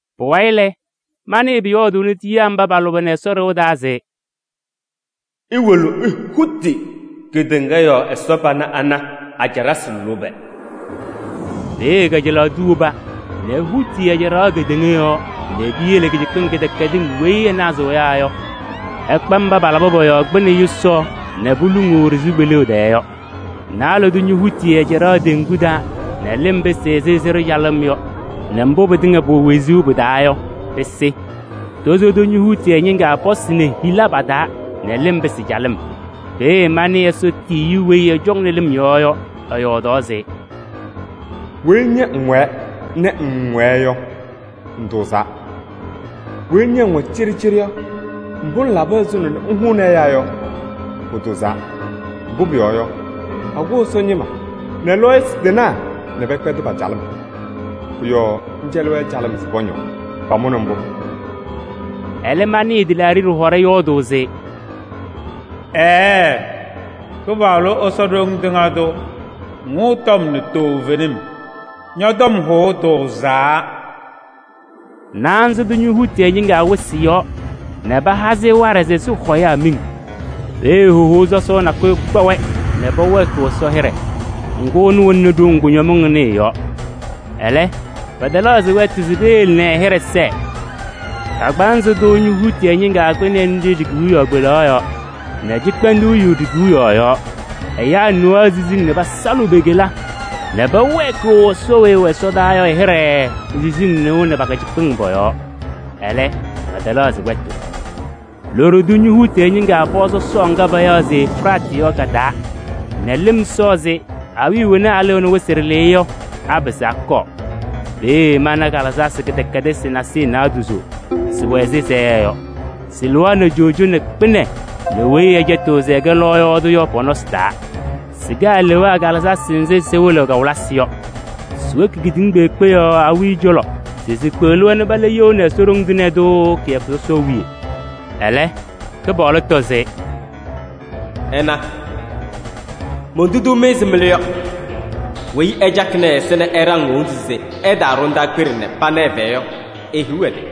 Pʋwayɩ lɛ, manɩɩ pʋyɔɔdʋʋnɩ tiyiyaa mba pa-lʋbɛ nɛ Ɛsɔ ɖɩɣa taa se: “Iwolo ihuti kedeŋa yɔɔ Ɛsɔ pana ana a-caɖasɩ lʋbɛ!” Peeye kajalaɣ tʋ woba nɛ ehuti ɛ-caɖaɣ kedeŋa yɔɔ nɛ piyele kɩcɩkpɩŋ kɩdɛkɛdɩŋ weyi ɩnazɩɣ ɛyaa yɔ, ɩkpa mba palabɩ pɔ-yɔɔ kpɩnɛ yʋsaɣ nɛ poluŋuu ɖɩ-sɩʋ kpeleɣ tɛɛ yɔ. Naalɛ tʋ ñohuti ɛ-caɖaɣ teŋgu taa nɛ lɩm pɩsɩ ɛzɩ sɩɖʋ calɩm yɔ nɛ mbʋ pɩtɩŋa pʋwɛ wezuu pɩ-taa yɔ, pɩsɩ. Tozo tʋ ñohuti ɛ-ñɩŋga pɔsɩ nɛ hila pa-taa nɛ lɩm pɩsɩ calɩm. Peeye manɩ Ɛsɔ tiyiyu weyi ɛcɔŋnɩ lɩm yɔɔ yɔ, ɛyɔɔdaɣ se: “Weyi ña ŋwɛɛ nɛ ŋŋwɛɛ yɔ, ŋtʋʋzaa. Weyi ña ŋwɛ cɩɖɩcɩɖɩ yɔ, mbʋ ŋlaba ɛzʋnɔ nɛ ŋhʋnɩ ɛyaa yɔ, pʋtʋʋzaa. Mbʋ pʋyɔɔ yɔ, pakʋ Ɛsɔ ñɩma nɛ lɔɔyɩsɩ tɩnaa nɛ pɛkpɛdɩ pa-calɩm. Pʋ-yɔɔ ŋcɛlɩ-wɛ calɩm se pɔñɔɔ, pamʋnɩ mbʋ.” Ɛlɛ manɩɩ tɩlaaɖɩ ɖɩhɔɖɛ yɔɔdʋʋ se: “Ɛɛ, Kɩpaɣlʋ Ɛsɔ Ɖoŋ Tɩŋa Tʋ! Ŋhʋʋ tɔm nɛ toovenim, ñɔ-tɔm hʋʋ tʋʋzaa.” Naanza tʋ ñohuti ɛ-ñɩŋga wɩsɩ yɔɔ nɛ paha-sɩ waɖɛ se sɩhɔ ɛyaa miŋ. Peeye hohou sɔsɔʋ nakʋyʋ kpa-wɛ nɛ pɛwɛɛkɩɣ Ɛsɔ hɩɖɛ. Ŋgʋ, ɛnʋ wɛnɩnɩ ɖoŋ kʋñɔmɩŋ ɩnʋ ɩ-yɔɔ. Ɛlɛ, pɛtɛlɛɣzɩ wɛtʋ se peyele nɛ ɛ-hɩɖɛ sɛɛ. Kagbaanzɩ tʋ ñohuti ɛ-ñɩŋga kpɩnɛ nɖɩ ɖi-kewiyaɣ kpelaɣ yɔɔ nɛ cɩkpɛndʋʋ yu ɖi-kewiyaɣ yɔɔ. Ɛyaa nɩɣaɣ siziŋ nɛ pasalɩɣ pe-kela nɛ pɛwɛɛkɩɣ Ɛsɔ weyi ɛwɛ ɛsɔdaa yɔ ɛ-hɩɖɛ pe-siziŋ nɩʋ nɛ pa-kɩcɩkpɩŋ pɔ-yɔɔ. Ɛlɛ, pɛtɛlɛɣzɩ wɛtʋ. Loɖo tʋ ñohuti ɛ-ñɩŋga pɔɔ sɔsɔɔ ŋga payaɣ se Efiraatɩ yɔ ka-taa nɛ lɩm sɔɔ se awiya wena alɩɣnɩ wɩsɩ ɖɩlɩyɛ yɔ, apɩzɩ akɔɔ. Peeye mana kalɩzasɩ kɩdɛkɛdɩsɩ nasɩyɩ naadozo, sɩwɛ ɛzɩ sayɛɛ yɔ. Sɩlɩɣaɣnɩ coojo nɛ kpɩnɛ nɛ weyi ɛcɛtɩɣ se ɛkɛ lɔɔyaɣ tʋ yɔ pɔ-nɔsɩ taa. Sɩkɛ alewaa kalɩzasɩ nzɩ sɩwɩlɩɣ kawɩlɩsɩ yɔ. Siwoki kedeŋa kpeekpe yɔɔ awiya cɔlɔ se sikpeɣli-wɛ nɛ pala you nɛ Ɛsɔ Ɖoŋ Tɩŋa Tʋ kɩyakʋ sɔsɔʋ wiye. Ɛlɛ Kɩpaɣlʋ tɔ se: “Ɩna, montuduu-mɩ ɛzɩ mɩlʋ yɔ. Weyi ɛcakɩnɩ ɛ-ɛza nɛ ɛɖaŋ e-wondu se ɛtaaɖɔ ndaakpeɖe nɛ pana ɛ-fɛyɛ yɔ, ehiɣ ɛ-tɩ!”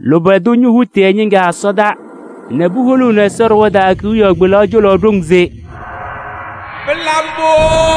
Lʋbɛ tʋ ñohuti ɛ-ñɩŋga ɛsɔdaa nɛ puholuuni Ɛsɔ ɖɩɣa taa kewiyaɣ kpelaɣ cɔlɔ ɖoŋ se: “Pɩlabɩ mbʋ!”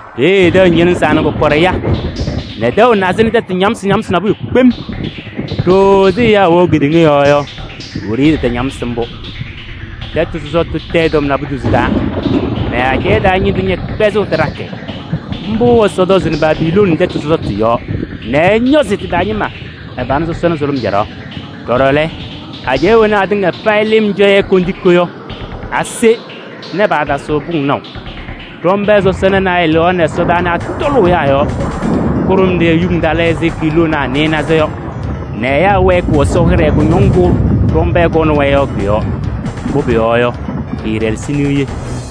Peeye tɛʋ ñɩlɩzaa nɛ kɔkɔɖɛ ya nɛ tɛʋ nazɩ nɛ tɛtʋ ñamsɩ ñamsʋʋ nabʋyʋ kpem. Ɖooo ɛzɩ ɛyaa wɛʋ kedeŋa yɔɔ yɔ, wiɖiyi tɩtañamsɩ mbʋ. Tɛtʋ sɔsɔtʋ tayɩ tɔm naadozo taa nɛ ajɛɛ taa ñɩndʋ ñɛkpɛzɩɣ tɩɖakɩ. Mbʋ Ɛsɔ tɔzɩnɩ Babilooni tɛtʋ sɔsɔtʋ yɔɔ nɛ ɛñɔzɩ tɩ-taa ñɩma ɛ-pana sɔsɔna sʋlʋm caɖaɣ. Ɖɔɖɔ lɛ, ajɛɛ wena atɩŋa payɩ lɩm cɔ-yɛ kondiko yɔ, ase nɛ paatasɩɣ pʋŋ naʋ. Ɖɔmbɛɛ sɔsɔna naayɛ lɩɣaɣnɩ ɛsɔdaa nɛ atɔlʋʋ ɛyaa yɔɔ. Kʋɖʋmɖɩyɛ yuŋ talɩ ɛzɩ kiiloonaa nɩɩnaza yɔ nɛ ɛyaa wɛɛkɩɣ Ɛsɔ hɩɖɛ kʋñɔŋ ŋgʋ ɖɔmbɛɛ kɔnɩ-wɛ yɔ kʋ-yɔɔ. Mbʋ pʋyɔɔ yɔ, kɩɩɖɛlɛsɩ niye.